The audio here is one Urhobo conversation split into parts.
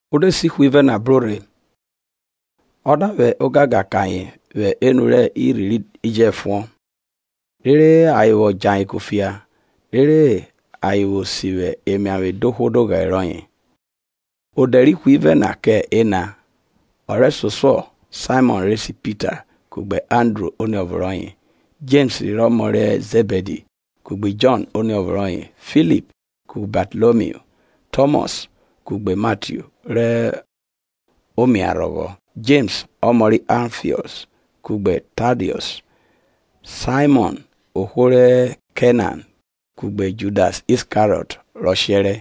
O de se ihwivẹ na bro rhe, o da vwẹ ogangan kẹ ayen vwẹ enu rẹ irhi ri jẹfuọn, rere ayen vwọ djẹ ayen kufia, rere ayen vwo sivwi emiavwe dohwo doghẹre rọye. Odẹ rẹ ihwivẹ na kẹ ena, ọ rẹsosuọ Saimọn re se Pita kugbe Andru oniọvo rọye, Jems rẹ ọmọ ri Zẹbidi, kugbe Jọn oniọvo rọye. Filip kugbe Batalomiu; Tọmọs kugbe Matiu rẹ omiarhọghọ; Jems ọmọ rẹ Alfiọs, kugbe Tadiọs. Saimọn ohwo ri Kenan, kugbe Judas Iskariọt rọ shẹrẹ.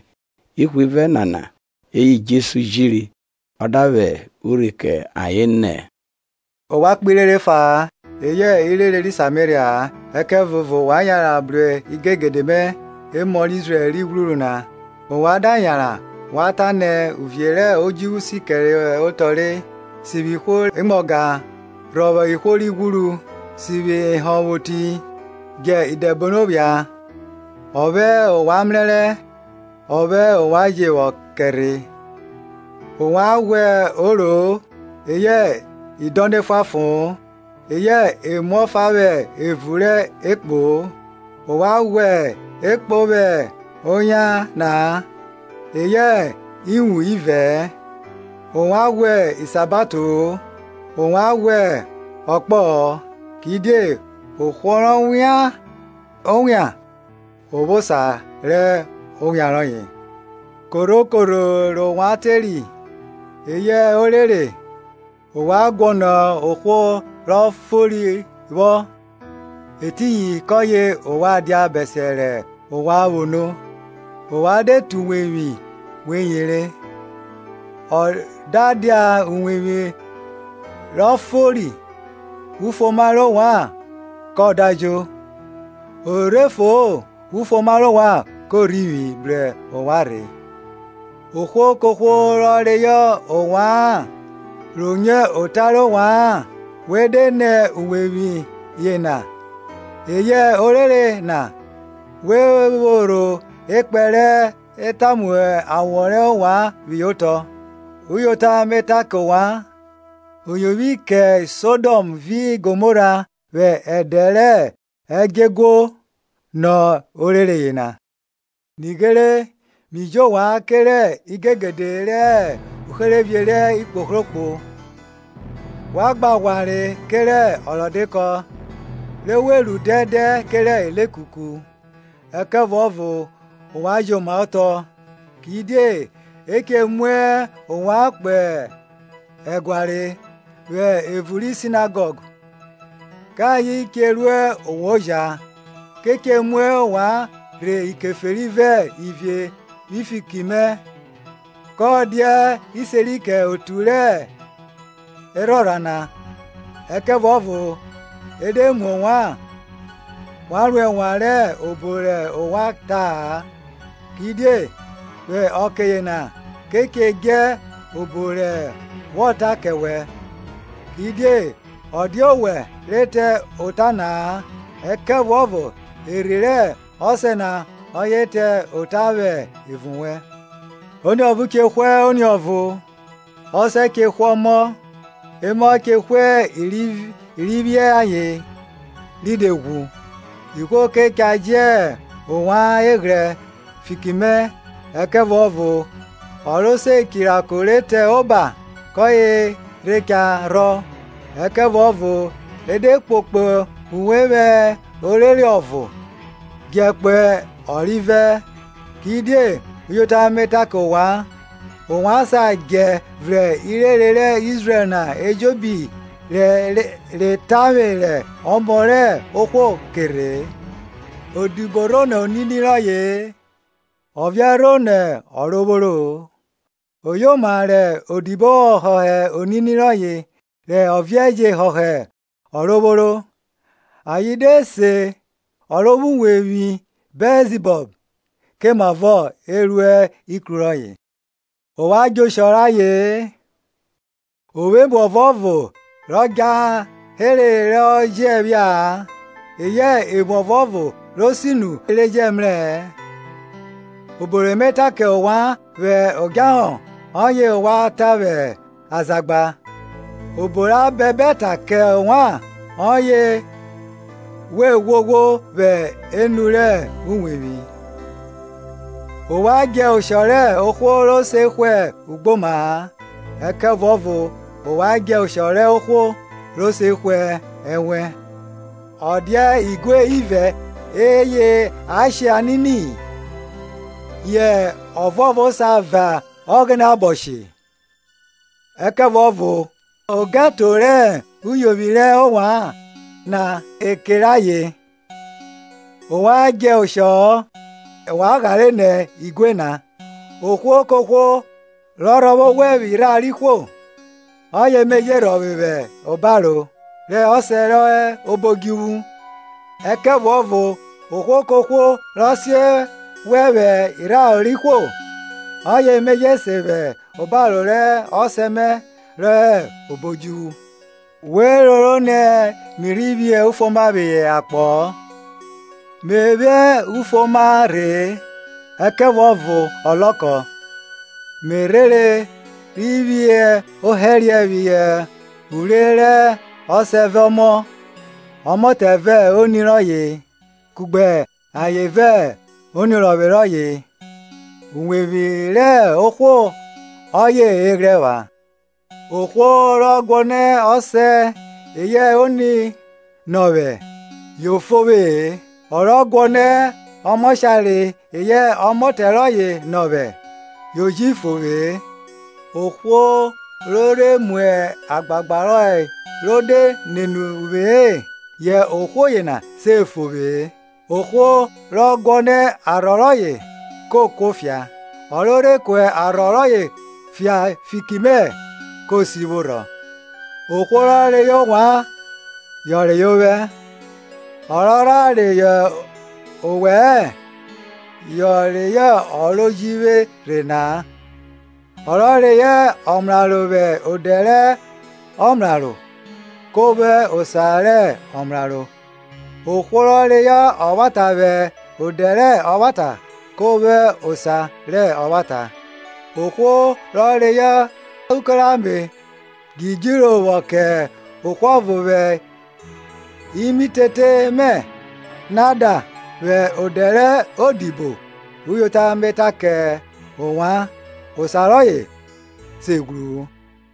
Ihwivẹ nana eye Jesu jiri, ọ da vwẹ urhi kẹ ayen nẹ, ovwan kpo irere efa-a, eyẹ irere ri Sameria-a. Ẹkẹvuọvo wa yanran bru igegede mẹ, emọ Izrẹl ri ghwruru na. Ovwan da yanran, wa ta nẹ, Uvie rẹ odjuvwu si kẹre otọ re. Sivwi ihwo re mwa ọga rhọvwọ ihwo ri ghwuru, sivwi ehonvwoti, djẹ idẹbono phia, ọphẹ ovwan mrẹrẹ, ọphẹ ovwan je vwọ kẹ rhe. Ovwan ghwa oro-o, eyẹ idọnọ efuanfo-on, eyẹ emu ọfa vwẹ evun rẹ ekpo-o. Ovwan ghwa ekpo vwẹ oyan na-a, eyẹ ewun ivẹ-ẹ, ovwan ghwa isabato-o, ovwan ghwa ọkpọ-ọ, kidie ohwo rọ wian owian o vwo osa rẹ owian rọye. Korho korho rẹ ovwan teri, eyẹ orere, ovwan guọnọ ohwo ro fori vwọ, etiyin kọye ovwan dia bẹsiẹ rẹ ovwan vwo no. Ovwan de te uwevwi we yere. Ọ da dia uwevwi ro fori, ufuoma rẹ ovwan kọ dajo. O rhe fo-o, ufuoma rẹ ovwan ko rhivwi bru ovwan rhe. Ohwo kohwo rọ reyọ ovwa-an, ro nyo ota rẹ ovwa-an, we de nẹ uwevwi yena eyẹ orere na, we phorho ekpẹn re tamu awọ rẹ ovwan phihọ otọ. Uyota me ta kẹ ovwan, o yovwi kẹ Sodọm vi Gomora vwẹ ẹdẹ rẹ ẹdjọeguo, nọ orere yena. Nighere mi ji ovwan kerẹ igegede re hẹ uherevie rẹ ikpohrokpo; wa gba ghwanre kerẹ ọrọdekọ, re we ru dẹndẹn kerẹ ilekuku. Ẹkẹvuọvo ovwan jomaotọ; kidie e che mu ovwan kpo ẹguare, vwẹ evun ri Sinagọg, kẹ ayen che ru ovwan oja. Ke che mu ovwan rhe ikeferi vẹ ivie vwi fiki mẹ, kẹ ovwan dia iseri kẹ otu rẹ ikeferi na. Ẹkẹvuọvo e de mu ovwan, wa ro ẹnwan rẹ obo rẹ ovwan cha ta-a, kidie vwe ọke yena ke che dje obo re wọ ra kẹ wẹ. Kidie ọ dia owẹ re ta ota na-a, ẹkẹvuọvo Erhi rẹ Ọsẹ na ọye re ta ota vwẹ evun wẹ. Oniọvo che hwe oniọvo, ọsẹ che hwe ọmọ, emọ che hwe i ri vwiẹ ayen, ri de ghwu. Ihwo ke cha jẹ ovwan eghrẹ fiki mẹ; ẹkẹvuọvo ọ ro se chirako ri te oba, kọye re cha rhọ Ẹkẹvuọvo e de kpokpo uwe vwẹ orere ọvo, djẹ kpo ọrivẹ. Kidie uyota me ta kẹ ovwan, ovwan sa djẹ vrẹn irere rẹ Izrẹl na ejobi re tavwe rẹ Ọmọ rẹ ohwo ke rhe-e. Odibo rho nọ onini rọye-e, ọviẹn rho nọ ọrovworo-o. Oyoma re odibo họhọ onini rọye, re oviẹn je họhọ ọrovworo. Ayen de se o ro vwo uwevwi Bẹlzibọl, komavo e ru ikru rọye. Ovwan djẹ oshọ rẹ aye-en; o vwo emu ọvuọvo rọ djahere ro jẹ phia-a, eyẹ emu ọvuovo re sinu re jẹ mrẹ-ẹ. Obo re me ta kẹ ovwan vwẹ odjahọ ọye ovwan ta vwẹ azagba, obo ra bẹbẹ ta kẹ ovwan, ọye we ghwoghwo vwẹ enu rẹ uwevwi. Ovwan djẹ oshọ rẹ ohwo ro se hwe ugboma-a, ẹkẹvuọvo wa djẹ oshọ rẹ ohwo rọ se hwe ẹnwẹn. Ọ dia igue ivẹ eye a shẹ anini? yẹ ọvuọvo sa va Ọghẹnẹ abọ she-e? Ẹkẹvuọvo ogẹto rẹ uyovwi rẹ ovwan na e kere ayen. Ovwan djẹ oshọ-ọ, ovwan ghare nọ igue na. Ohwo kohwo rọ rhọvwe ovwẹ vwẹ irharo rẹ ihwo, ọye me je rhọvwe vwẹ obaro rẹ ọsẹ rọ hẹ obo odjuvwu. Ẹkẹvuọvo ohwo kohwo rọ sen vwẹ vwẹ irharo rẹ ihwo, ọye me je sen vwẹ obaro rẹ ọsẹ mẹ rọ hẹ obo odjuvwu. We roro ni mi rhi phi ufuoma phihọ akpọ-ọ, me vwẹ ufuoma rhe-e, ẹkẹvuọvo ọlọkọ. Me rhere rhi phi ohẹriẹ phihọ uvwre rẹ ọsẹ vẹ ọmọ, ọmọtẹ vẹ oni rọye, kugbe aye vẹ oniorọvwe rọye. Uwevwi rẹ ohwo ọye ọvweghrẹ rọye epha. Ohwo ro guọnọ ọsẹ eyẹ oni nọ vwẹ, yo fo vwe-e; ọ rọ guọnọ ọmọshare eyẹ ọmọtẹ rọye nọ vwẹ, yo ji fo vwe-e. Ohwo ro rhe mu agbagba rọye ro de nene uvwe-e, yẹ ohwo yena se fo vwe-e. Ohwo rọ guọnọ arhọ rọye ko kuofia, ọ ro rhe ku arhọ rọye fia fiki mẹ ko sivwo rhọ. Ohwo rọ reyọ ovwan yọ reyọ ovwẹ, ọ rọ rha reyọ ovwẹ-ẹ, yọ reyọ ọ ro ji vwe rhe na-a. Ọ rọ reyọ ọmraro vwẹ odẹ rẹ omraro, ko vwo osa rẹ omraro. Ohwo ro reyọ ọvwata vwẹ odẹ rẹ ọvwata ko vwo osa rẹ ovwata. Ohwo ro reyọ uko rẹ ame djidjiro vwọ kẹ ọvo vwẹ imitete mẹ na da vwẹ odẹ rẹ odibo, uyota me ta kẹ ovwan, osa rọye se ghwru-u.